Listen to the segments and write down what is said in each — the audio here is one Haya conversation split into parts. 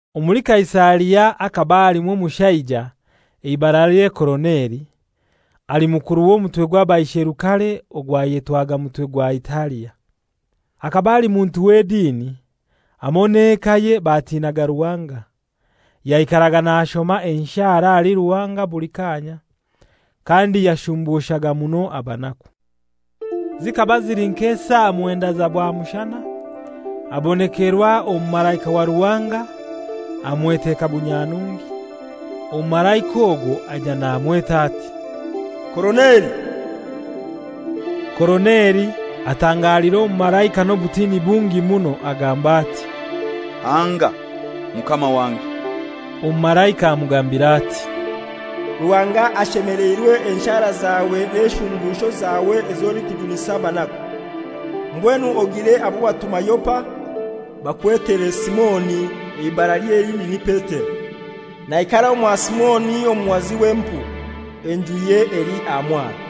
Omuli Kaisaria hakaba halimu omushaija, eibaralye Koroneli, ali mukuru w'omutwe gw'abaisherukare ogwayetwaga Mutwe gwa Italia. Akaba ali muntu w'edini; hamoi n'ekaye batinaga Ruhanga. Yaikaraga nashoma enshara ahali Ruhanga buli kaanya, kandi yashumbushaga muno abanaku. Zikaba zili nk'esaa mwendai za bwamushana abonekerwa omumalaika wa Ruhanga amweteka bunyanungi, omumalaika ogwo aija namweta ati, «Koroneli!» Koroneli atangalira omumalaika n'obutini bungi muno agamba ati, «Hanga, mukama wange.» Omumalaika amugambira ati, «Ruhanga ashemeleirwe enshara zawe n'eshumbusho zawe ez'olikujunisa abanaku. Mbwenu ogire abo watuma Yopa, bakwetere Simoni, eibaralye elindi ni Petero. Naikara omwa Simoni omuhazi w'empu, enjuye eli aha mwaro.»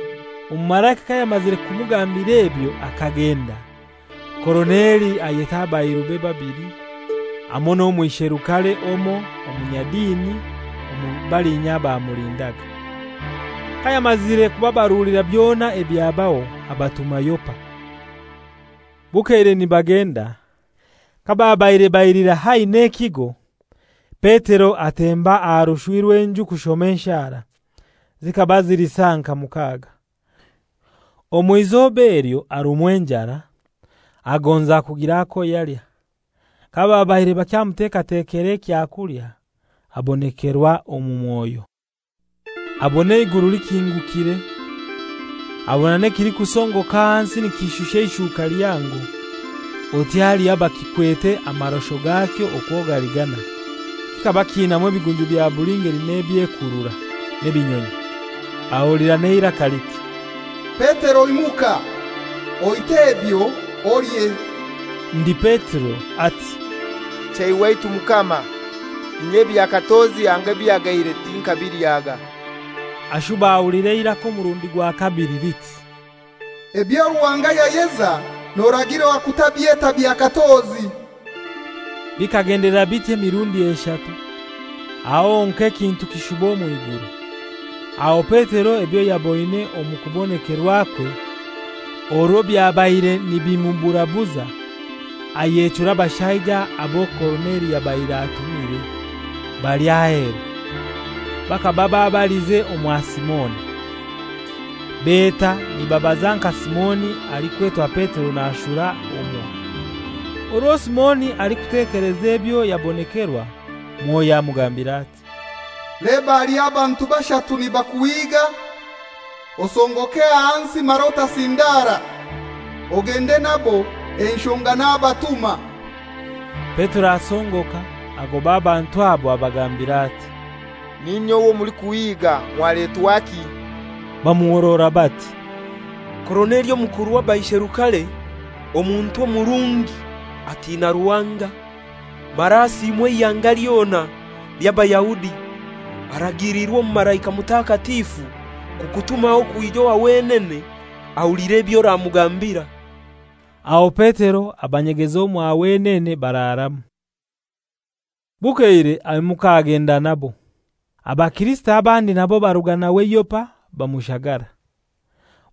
Omumalaika kayamazire kumugambira ebyo akagenda, Koroneli ayeta abairube babili hamoi n'omwisherukare omoi omunyadini omuli balinya abamulindaga. Kayamazire kubabarulira byona ebyabaho abatuma Yopa. Bukeire nibagenda, kababaire baija hai n'ekigo, Petero atemba aha rushwi rw'enju kushoma enshara; zikaba zili saa nka mukaaga. Omw'izoba elyo arumwa enjara, agonza kugira ako yalya. Kababaire bakyamutekatekera ekyakulya, abonekerwa omu mwoyo. Abona eiguru likingukire, abona n'ekilikusongoka ahansi nikishusha eishuka lihango, oti haliho abakikwete amarosho gakyo okwo gali ganai. Kikaba kiinamu ebigunju bya buli ngeli nebyekurura, n'ebinyonyi. Ahulira n'eiraka liti, «Petero imuka, oite ebyo, olye.» Ndi Petero ati, «Chei waitu Mukama; inye ebya katozi anga ebihagaire tinkabilyaga.» Ashuba ahulira eiraka omurundi gwa kabili liti, «Ebyo Ruhanga yayeza noragirwa kutabyeta bya katozi.» Bikagendelera biti emirundi eshatu, aho honkai ekintu kishuba omw'iguru. Aho Petero ebyo yaboine omu kubonekerwakwe orwo byabaire nibimuburabuza, ayechura abashaija abo Koroneli yabaire atumire bali aheru. Bakaba babalize omwa Simoni. Beta nibabaza nka Simoni alikwetwa Petero nashura omwo. Orwo Simoni alikutekeleza ebyo yabonekerwa, Mwoyo amugambira ati, «Leba aliho abantu bashatu nibakuhiga. Osongoke ahansi mara otasindara, ogende nabo; enshonga nabatuma.» Petero asongoka agoba abantu abo abagambira ati, «N'inye owo mulikuhiiga; mwaletwaki?» Bamuhorora bati, «Koroneli omukuru w'abaisherukare, omuntu omurungi atina Ruhanga, mara asiimwa eihanga lyona ly'Abayahudi, aragiliirwe omumalaika mutakatifu kukutumaho kwija owa wenene, ahulire eby'oramugambira.» Aho Petero abanyegeza omwa wenene bararamu. Bukeire aimuka agenda nabo. Abakirisito abandi nabo baruga nawe Yopa bamushagara.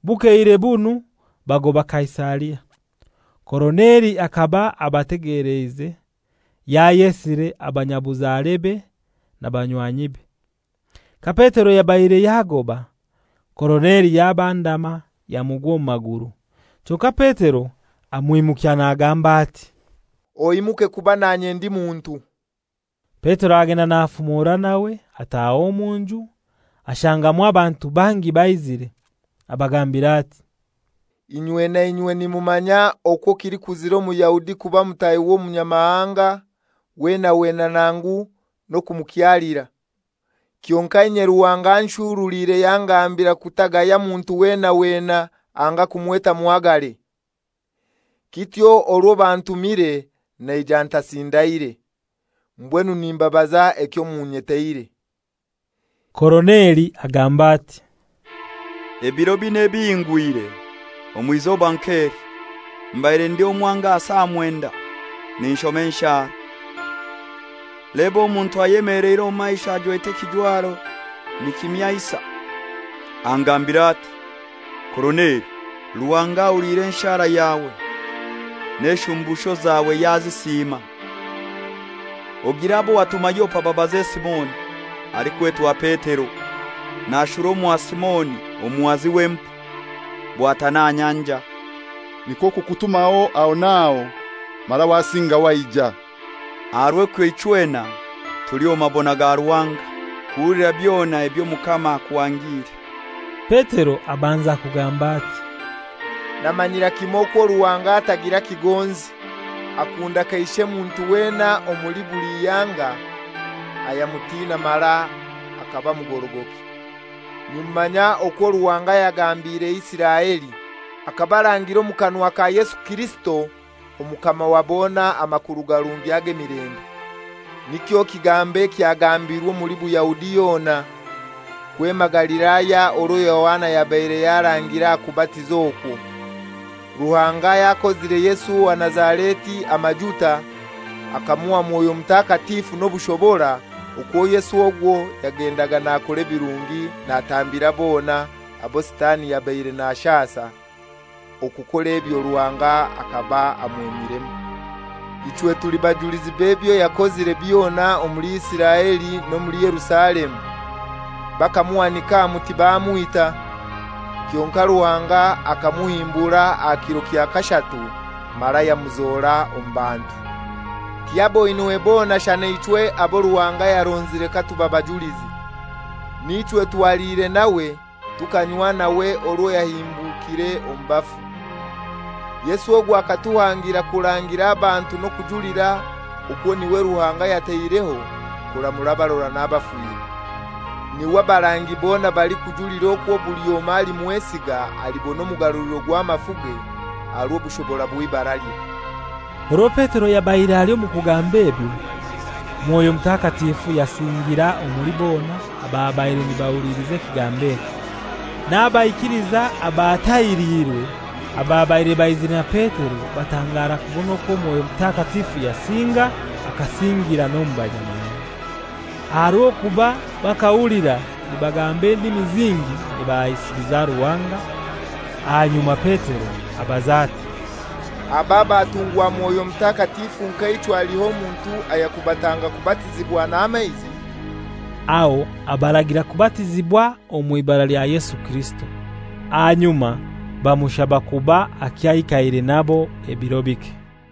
Bukeire bunu bagoba Kaisaria. Koroneli akaba abategeleize, yayesire abanyabuzarebe na banywanyibe. Ka Petero yabaire yagoba, Koroneli yabandama yamugwa omu maguru. Kyonkai Petero amwimukya nagamba ati, «Oimuke; kuba nanye ndi muntu.» Petero agenda nafumora nawe ataaha omu nju ashangamu abantu bangi baizire. Abagambira ati, «Inywe nainywe nimumanya okwo kilikuzira Omuyahudi kuba mutahi w'omunyamahanga weena weena nangu n'okumukyalira. Kyonkai inye Ruhanga anshurulire yangambira kutagaya muntu weena weena anga kumweta muhagare. Kityo orwo bantumire naija ntasindaire. Mbwenu nimbabaza ekyo munyeteire.» Koroneli agamba ati, «Ebiro binai ebihingwire, omw'izoba nk'eli, mbaire ndi omwange aha saa mwendai ninshoma enshara. Leba omuntu anyemeleire omu maisho ajwete ekijwaro nikimyansa. Angambira ati, ‹Koroneli, Ruhanga ahuliire enshara yawe, n'eshumbusho zawe yazisiima. Ogire abo watuma Yopa babaze Simoni alikwetwa Petero, nashura omwa Simoni omuhazi w'empu, bwatana aha nyanja.› Nikwo kukutumaho aho n'aho, mara wasinga waija. Aha rw'ekyo ichwena tuli omu mabona ga Ruhanga kuhulira byona eby'Omukama akuhangiire.» Petero abanza kugamba ati, «Namanyira kimoi okwo Ruhanga atagira kigonzi. Akunda kaishe muntu weena omuli buli ihanga ayamutina mara akaba mugorogoki. Nimumanya okwo Ruhanga yagambire Isiraeli, akabarangira omu kanwa ka Yesu Kirisito Omukama wa bona amakuru garungi ag'emilembe. Nikyo kigambo ekyagambirwe omuli Buyahudi yona, kwema Galilaya orwo Yohana yabaire yarangire aha kubatiza okwo, Ruhanga yakozire Yesu owa Nazareti amajuta, akamuha Mwoyo Mutakatifu n'obushobora, okwo Yesu ogwo yagendaga nakora ebirungi natambira bona abo Sitani yabaire nashasa. Okukora ebyo Ruhanga akaba amwemiremu. Ichwe tuli bajulizi b'ebyo yakozire byona omuli Isiraeli n'omuli Yerusalemu. Bakamuhanika aha muti bamwita. Kyonkai Ruhanga akamuhimbura aha kiro kya kashatu mara yamuzora omu bantu. Tiyaboinwe bona shana ichwe abo Ruhanga yaronzire katuba bajulizi. Nichwe twaliire nawe tukanywa nawe orwo yahimbukire omu bafu. Yesu ogwo akatuhangira kurangira abantu n'okujulira okwo n'iwe Ruhanga yataireho kuramura abarora n'abafire. N'iwe abarangi bona balikujulira okwo buli omoi alimwesiga alibona omugaruliro gw'amafuge aha rw'obushobora bw'eibaralye.» Orwo Petero yabaire ali omu kugamba ebyo, Mwoyo Mutakatifu yasingira omuli bona ababaire nibahuliliza ekigambo ekyo. N'abaikiliiza abatahiriirwe ababaire baizire na Petero batangara kubona okwo Mwoyo Mutakatifu yasinga akasingira n'omu banyamahanga. Aha rw'okuba bakahulira nibagamba endimi zingi nibahaisiliza Ruhanga. Ahanyuma Petero abaza ati, «Aba abatungwa Mwoyo Mutakatifu nka ichwe haliho omuntu ayakubatanga kubatizibwa n'amaizi?» Aho abaragira kubatizibwa omw'ibara lya Yesu Kirisito. Ahanyuma bamushaba kuba akyaikaire nabo ebiro bike.